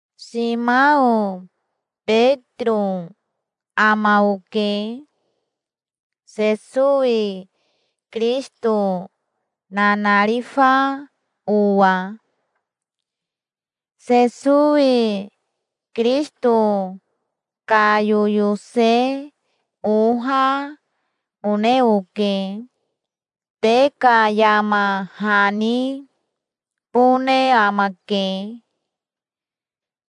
Simao Betiro ama oke, Sesowi Kirisito nanarifa owa. Sesowi Kirisito ka yoyose oha one oke. Te ka yama hanibone amake,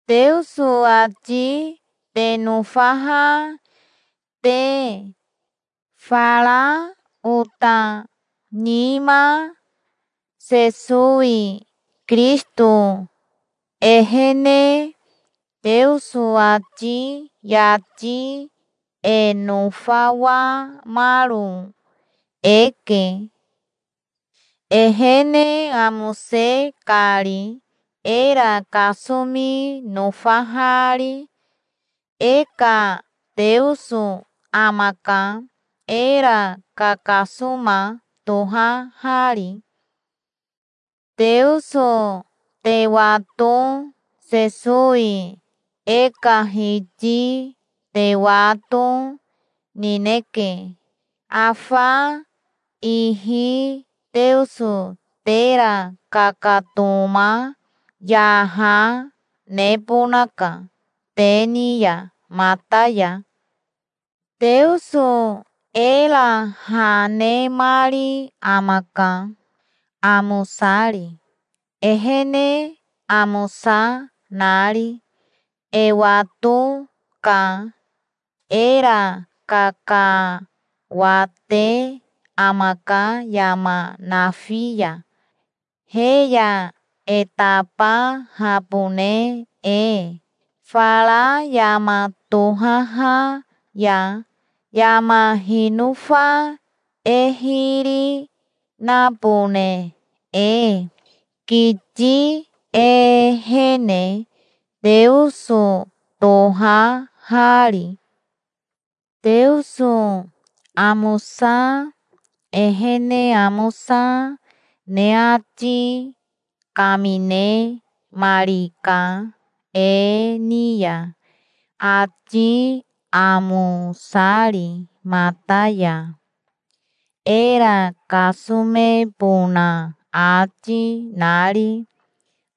Teoso ati te nofaha te, fara ota nima. Sesowi Kirisito ehene Teoso ati yati e nofawamaro eke, ehene amose kari era kasomi nofahari. E ka Teoso amaka, era kakasoma tohahari. Teoso te wato, Sesowi e ka Hiti te wato, nineke. Afa ihi Teoso tera kakatoma, yaha, nebonaka te ni ya mata ya. Teoso era ha nemari amaka, amosari, ehene amosa nari. E wato ka era kakawate amaka yama nafi ya, he ya e tabahabone e fara yama tohaha ya, yama hinofa e hiri, nabone e, kiti ehene, Teoso tohahari. Teoso amosa, ehene amosa, ne ati kaminemarika e ni ya, ati amosari mata ya, era kasomebona ati nari.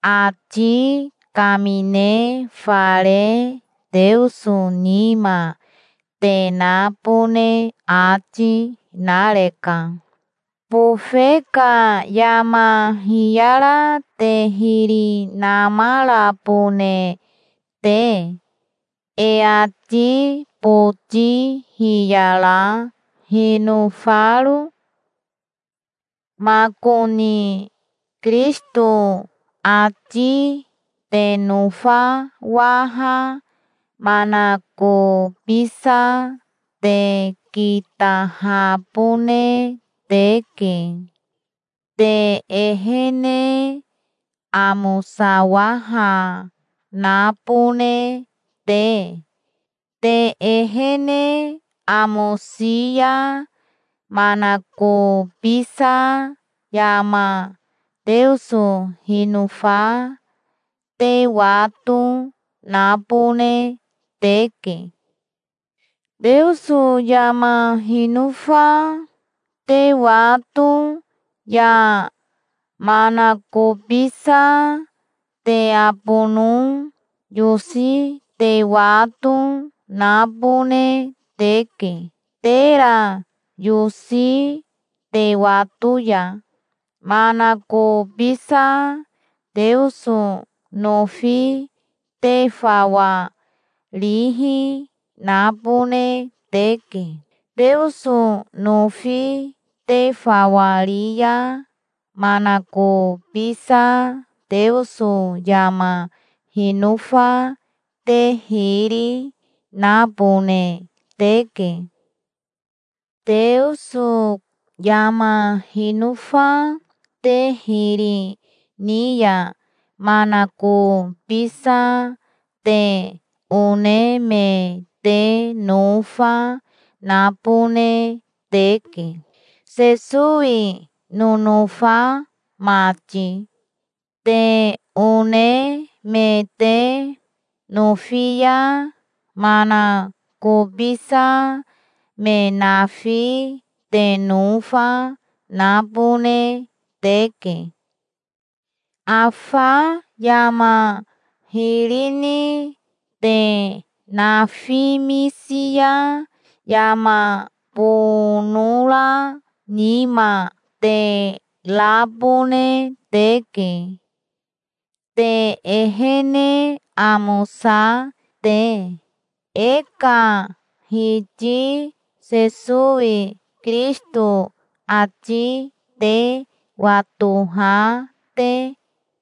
Ati kamine fare Teoso nima te nabone ati nareka, bofe ka yama hiyara te hiri namarabone te, e ati boti hiyara hinofaro. Makoni Kirisito ati te nofawaha manakobisa te kitahabone teke, te ehene amosawaha nabone te. Te ehene amosi ya manakobisa yama Teoso hinofa te wato nabone teke. Teoso yama hinofa te wato ya manakobisa te abono yosi te wato nabone teke. Tera yosi te wato ya manakobisa Teoso nofi te fawa rihi nabone teke. Teoso nofi te fawa ri ya manakobisa Teoso yama hinofa te hiri, nabone teke. Teoso yama hinofa te hiri ni ya manakobisa te one me te nofa nabone teke, Sesowi nonofa mati. Te one me te nofi ya manakobisa me nafi te nofa nabone teke. Afa yama hiri ni te nafimisi ya yama bonora nima te rabone teke, te ehene amosa te, e ka Hiti Sesowi Kirisito ati te watoha te.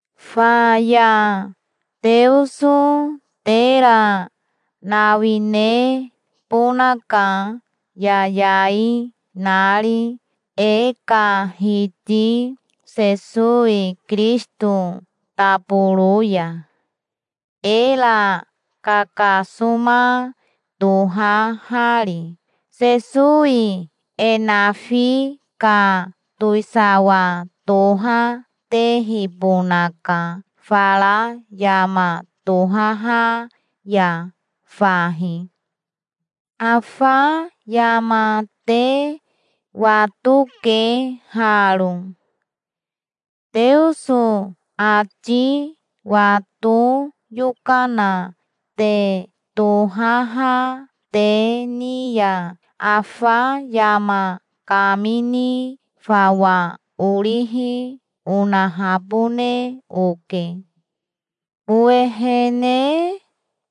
Faya Teoso tera nawinebonaka yayai nari e ka Hiti Sesowi Kirisito taboro ya, era kakasoma tohahari. Sesowi e nafi ka towisawa tohatehibonaka fara yama tohaha ya fahi. Afa yama te watoke haro. Teoso ati wato yokana te tohaha te ni ya afa yama kamini fawa orihi onahabone oke. Owehene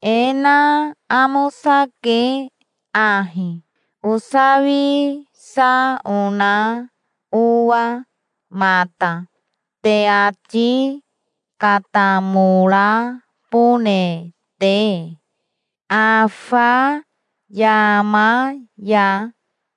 e na amosake ahi, osawisa ona owa mata, te ati katamorabone te afa yama ya.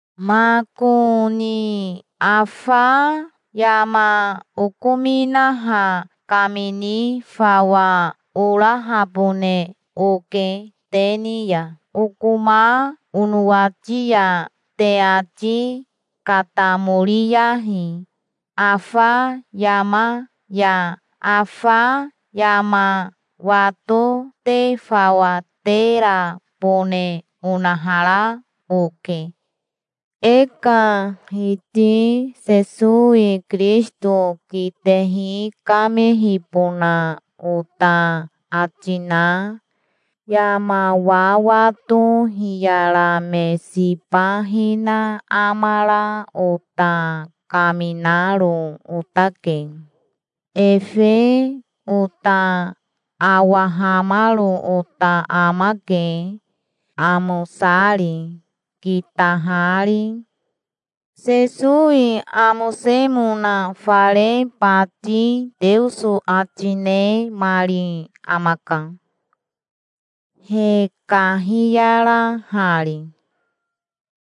Makoni afa yama okominaha kamini fawa orahabone oke te ni ya. Okoma onowati ya te ati katamoriyahi afa yama ya. Afa yama wato te fawa terabone onahara oke. E ka Hiti Sesowi Kirisito kitehi kamehibona ota ati na, yama wawato hiyara me siba hina amara ota kaminaro otake. Efe ota awahamaro ota amake, amosari, kitahari. Sesowi amosemona fare bati Teoso ati nemari amaka, he kahiyarahari.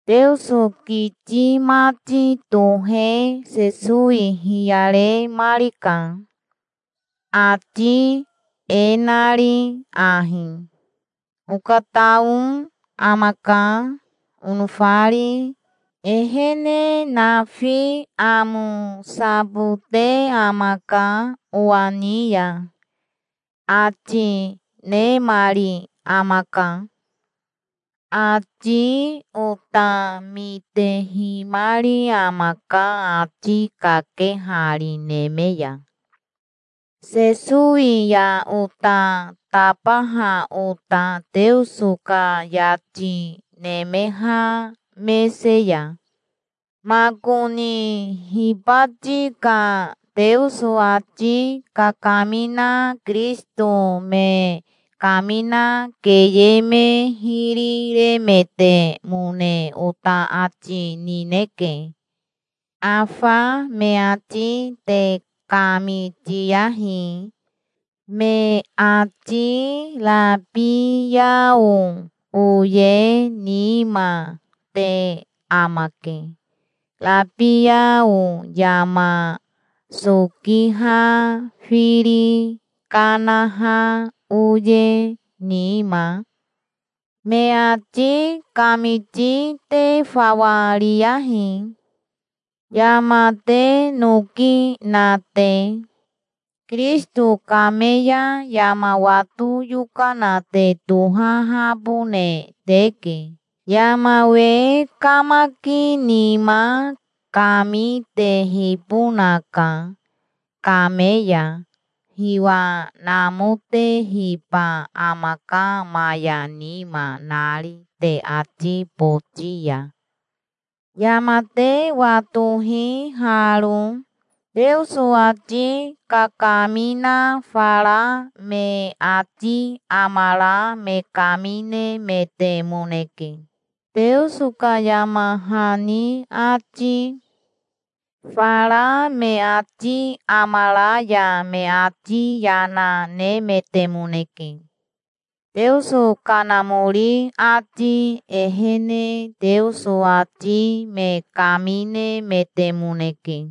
Teoso kiti mati tohe Sesowi hiyaremarika, ati e nari ahi: "Okatao amaka, onofari. Ehene nafi amosabote amaka owa ni ya", ati nemari amaka. Ati ota mitehimari amaka ati kakehari neme ya, Sesowi ya ota tabaha ota Teoso ka yati nemeha mese ya. Makoni hibati ka Teoso ati kakamina Kirisito me kamina keye me hiri remetemone ota ati nineke. Afa me ati te kamitiyahi. Me ati rabiao oye nima te amake, rabiao yama sokiha firi kanaha oye nima. Me ati kamiti te fawa riyahi, yama te noki na te. Kirisito kame ya yama wato yokana te tohahabone teke. Yama we kamaki nima kami tehibonaka. Kame ya hiwa namotehiba amaka maya nima nari te ati boti ya. Yama te watohi haro: Teoso ati kakamina fara me ati amara me kaminemetemoneke, Teoso ka yama hani ati. Fara me ati amara ya me ati yana nemetemoneke. Teoso Kanamori ati ehene Teoso ati me kaminemetemoneke.